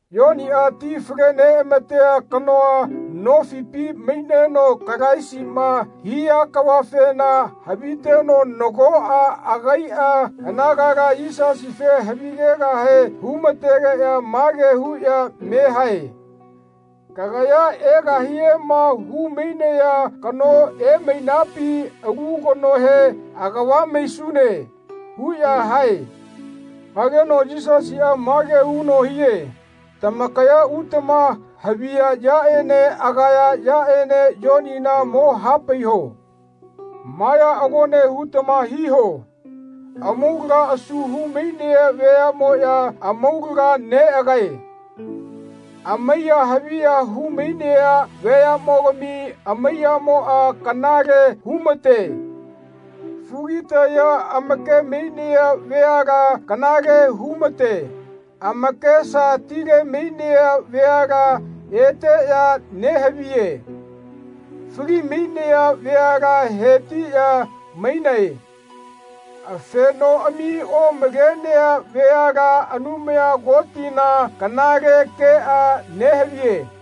Yoniꞌa ti fale neꞌamatea kanoa nofipi maineno Kalaisiꞌma hia kavafena haviteno nagoꞌa agaiꞌa anagala Yisasife havigegahe hu-ma-tegeꞌya mage huꞌya me hae “Kagaya egahiema hu-mainaya kano emainapi alu kanohe agava maisune?” huꞌya hae. Hageno Yisasiꞌa mage huno hie “Tamakaya utama haviya yaꞌene agaya yaꞌene Yonina mo hapaiho. Ma ya agone hutama hiho amaulaga asu hu-mainea veaꞌmoꞌya amaulaga neꞌagae. Amaiya haviya hu-mainea veaꞌmogami amaiyamoꞌa kanale hu-mate. Fugitaya amake-mainea veala kanale hu-mate. Amakesa tile-mainea veala eteꞌya nehaviye. Fali-mainaya veala hetiꞌya mainae. Afenoꞌami omalenea veala Anumaya Kotina kanale keꞌa nehaviye.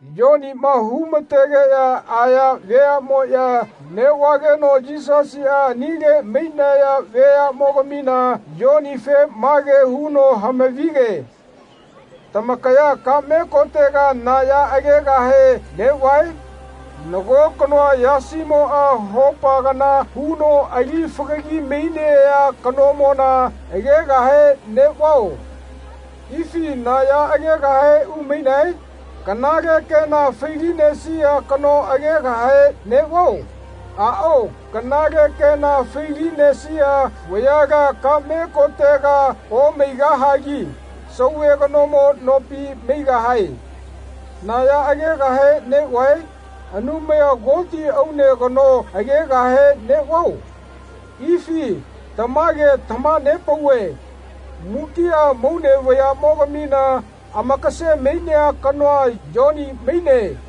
Yoniꞌma hu-ma-tegeꞌya aya veaꞌmoꞌya neꞌvageno Yisasiꞌa anile mainaya veaꞌmogamina Yonife mage huno hamavige “Tamakaya kaꞌme kotega na ya mogegahe neꞌvae? Nago kanoa yasimoꞌa hopa kana huno ali fagagi mainea kanomona agegahe neꞌvao? Ifi na ya agegahe umainae? Kanale kena fai-linesia kano agegahe neꞌvao? Aꞌao kanale kena fai-linesaya vayala kaꞌme kotega omaigahagi sauve kanomo nopi maigahae. Na ya agegahe neꞌvae? Anumaya Koti aune kano agegahe neꞌvao? Ifi tamage tamaha-nepauve mukiꞌa amaune vayaꞌmogamina amakase-mainea kanoa Yoni maine.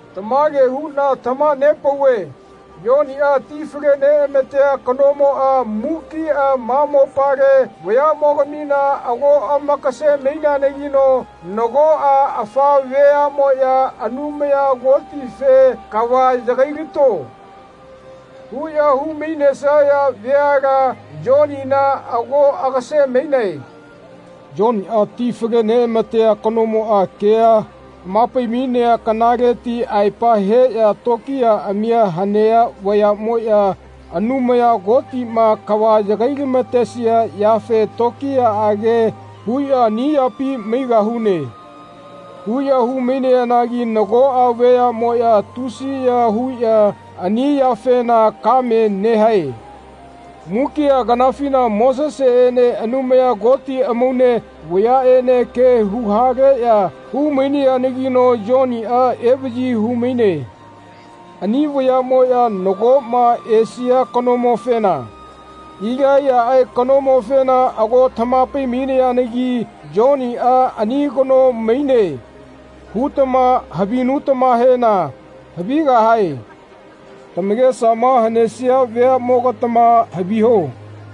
Tamage huꞌna tamaha-nepauve Yoniꞌa ti fale-neꞌamatea kanomoꞌa mukiꞌa ma mopale vayaꞌmogamina ago amakase-maineanagino nagoꞌa afa veaꞌmoꞌya Anumaya Kotife ‘Kava yagailato.’ huꞌya hu-mainesaya veala Yonina ago agase-mainae. Yoniꞌa ti fale-neꞌamatea kanomoꞌa kea hama-pai-mainea kanaleti aepa heꞌya tokiyaꞌami hanea veaꞌmoꞌya Anumaya Kotiꞌma kava yagai-lama-tesia yafe tokiyaꞌage huꞌya ‘Ani yapi maigahune.’ huꞌya hu-mainayanagi nagoꞌa vayaꞌmoꞌya tusiya huꞌya ani yafena kame nehae. Mukiꞌa kanafina Moseseꞌene Anumaya Koti amaune vayaꞌene kea hu-haleꞌya hu-mainayanagino Yoniꞌa evaꞌyi hu-maine. Ani vayaꞌmoꞌya nagoꞌma esia kanomofena, Ilaiyaꞌe kanomofena ago tamaha-pai-mainayanagi ‘Yoniꞌa ani kano maineꞌ hutama havinutamahena havigahae. Tamakesama hanesia veaꞌmogatama haviho.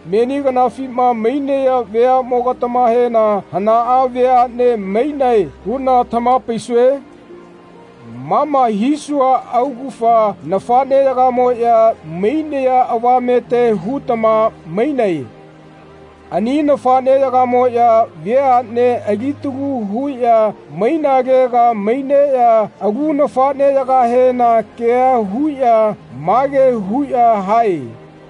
Meni kanafima mainaya veaꞌmogatamahena hanaꞌa veaꞌne mainae huꞌna tamaha-paisue? Ma ma hisua augafa nafaꞌneyagamoꞌya mainaya avamete hutama mainae. Ani nafaꞌneyagamoꞌya veaꞌne alitalu huꞌya mainalega maineꞌya alu nafaꞌneyagahena ke huꞌya mage huꞌya hae.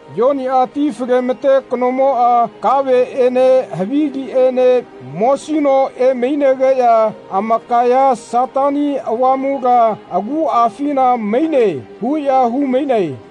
Yoniꞌa ti fale-ma-te kanomoꞌa kaveꞌene haviliꞌene mosino emainegeꞌya amakaya ‘Satani Avamula aguꞌafina maine.’ huꞌya hu-mainae.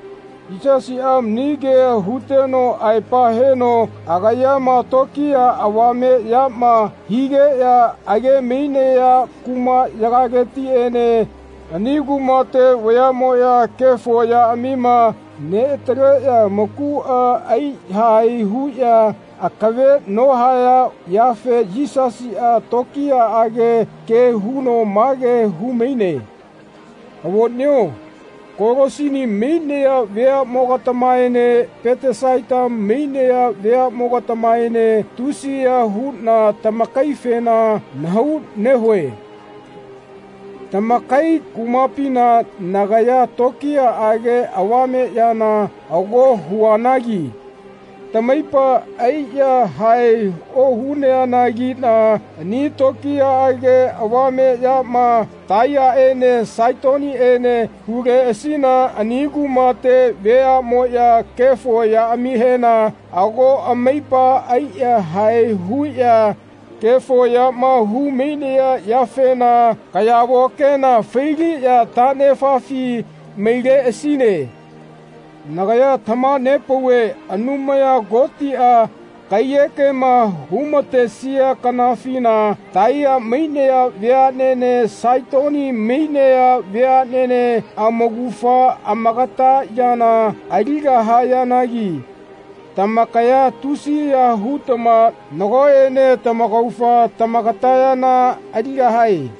Yisasiꞌa mani kea huteno aepa heno agayama tokiya avame yama higeꞌya age-mainaya kumaꞌyagaletiꞌene ani kumate veaꞌmoꞌya kefo yaꞌamia neꞌataleꞌya amakuꞌa ai-yahae huꞌya akave nohaya yafe Yisasiꞌa tokiyaꞌage ke huno mage hu-maine. “Avoꞌneo Kolasini mainaya veaꞌmogatamaene Petesaita mainaya veaꞌmogatamaene tusiya huꞌna tamakaifena nahau nehue. Tamakai kumapina nagaya tokiyaꞌage avameꞌyana ago huanagi tamaipa ai-yahae ohayanagiꞌna ani tokiyaꞌage avame yama Taiyaene Saitoniene huleꞌasina ani kumate veaꞌmoꞌya kefo yaꞌamihena ago amaipa ai-yahae huꞌya kefo yama hu-mainaya yafena kayavo kena fai-liꞌya taꞌnefafi maileꞌasine. Nagaya tamaha-nepauve Anumaya Kotiꞌa kaiyekema hu-ma-tesia kanafina Taiya mainaya veaꞌnene Saitoni mainaya veaꞌnene amaugafa amagata yana aligahayanagi tamakaya tusiya hutama nagoꞌene tamaugafa tamagata yana aligahae.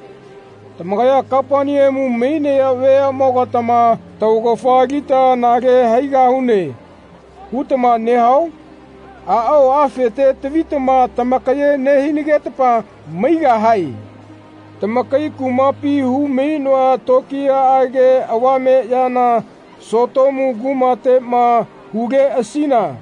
Tamakaya Kapaneamu mainaya veaꞌmogatama ‘Taugafa alita anale haigahune.’ hutama nehao? Aꞌao afete tavitama tamakaye nehinagetama maigahae. Tamakai kumapi hu-mainoa tokiyaꞌage avame yana Sotomu kumateꞌma huleꞌasina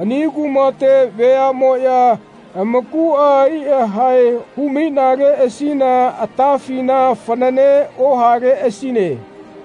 ani kumate veaꞌmoꞌya amakuꞌa ai-yahae hu-mainaleꞌasina atafina fanane ohaleꞌasine.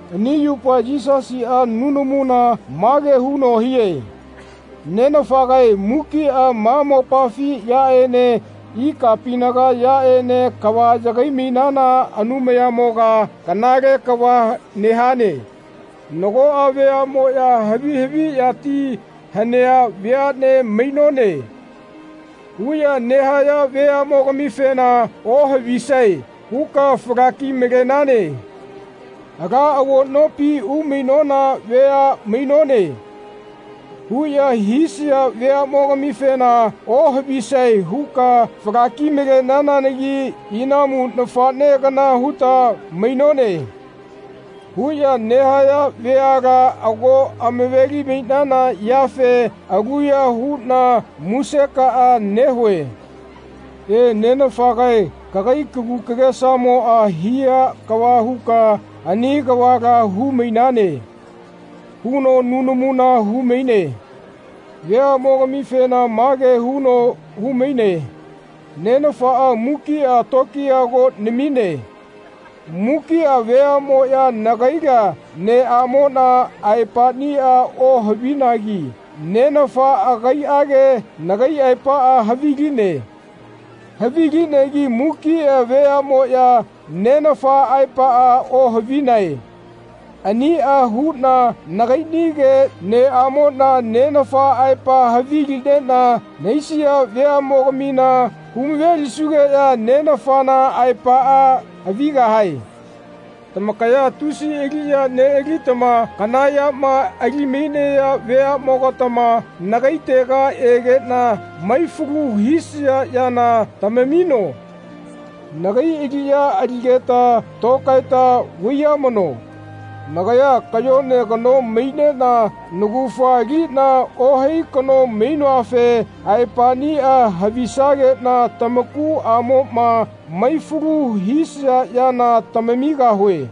Ani yupa Yisasiꞌa nunamuna mage huno hie “Nenafagae mukiꞌa ma mopafi yaꞌene ikapinaga yaꞌene kava yagai-mainana Anumayamoga kanale kava nehane. Nagoꞌa veaꞌmoꞌya ‘Havi haviꞌyati hanea vea mainone.’ huꞌya nehaya veaꞌmogamifena ohavisae huka fala-ki-malenane. ‘Ala avo nopi umainona vea mainone.’ huꞌya hisaya veaꞌmogamifena ohavisae huka fala-ki-malenanagi ‘Inamu nafaꞌne kana huta mainone.’ huꞌya nehaya veala ago amaveli-mainana yafena aluya huꞌna musekaꞌa nehue. E, Nenafagae kagai kagu kagesamo hia kava huka ani kavala hu-mainane.” huno nunamuna hu-maine. Veaꞌmogamifena mage huno hu-maine “Nenafaꞌa mukiꞌa lokiya ago namine. Mukiꞌa veaꞌmoꞌya nagaila neꞌamonina aepaꞌnia ohavinagi Nenafaꞌa agaiꞌage nagai aepaꞌa haviline. Havilinegi mukiꞌa veaꞌmoꞌya Nenafa aepaꞌa ohavinae. Aniꞌa huꞌna nagaiꞌnige neꞌamoꞌna Nenafa aepaꞌa havilineꞌna nahaisia veaꞌmogamina hu-mave-lisugeꞌya Nenafana aepaꞌa havigahae. Tamakaya tusi aliꞌya neꞌalitama kana yama ali-mainaya veaꞌmogatama nagaitega egeꞌna mai-falu hisaya yana tamamino. Nagai aliꞌya aligeta tokaeta vaiyamano. Nagaya kayone kano maineꞌna naugafa aliꞌna ohai kano mainoafe aepaꞌnia havisageꞌna tamakuꞌamoꞌma mai-falu hisia yana tamamigahue.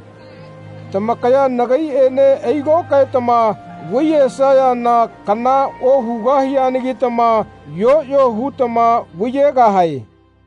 Tamakaya nagaiꞌene ai-lokaetama vaiyesayana kana ohugahianagitama yoꞌyo hutama vaiyegahae.”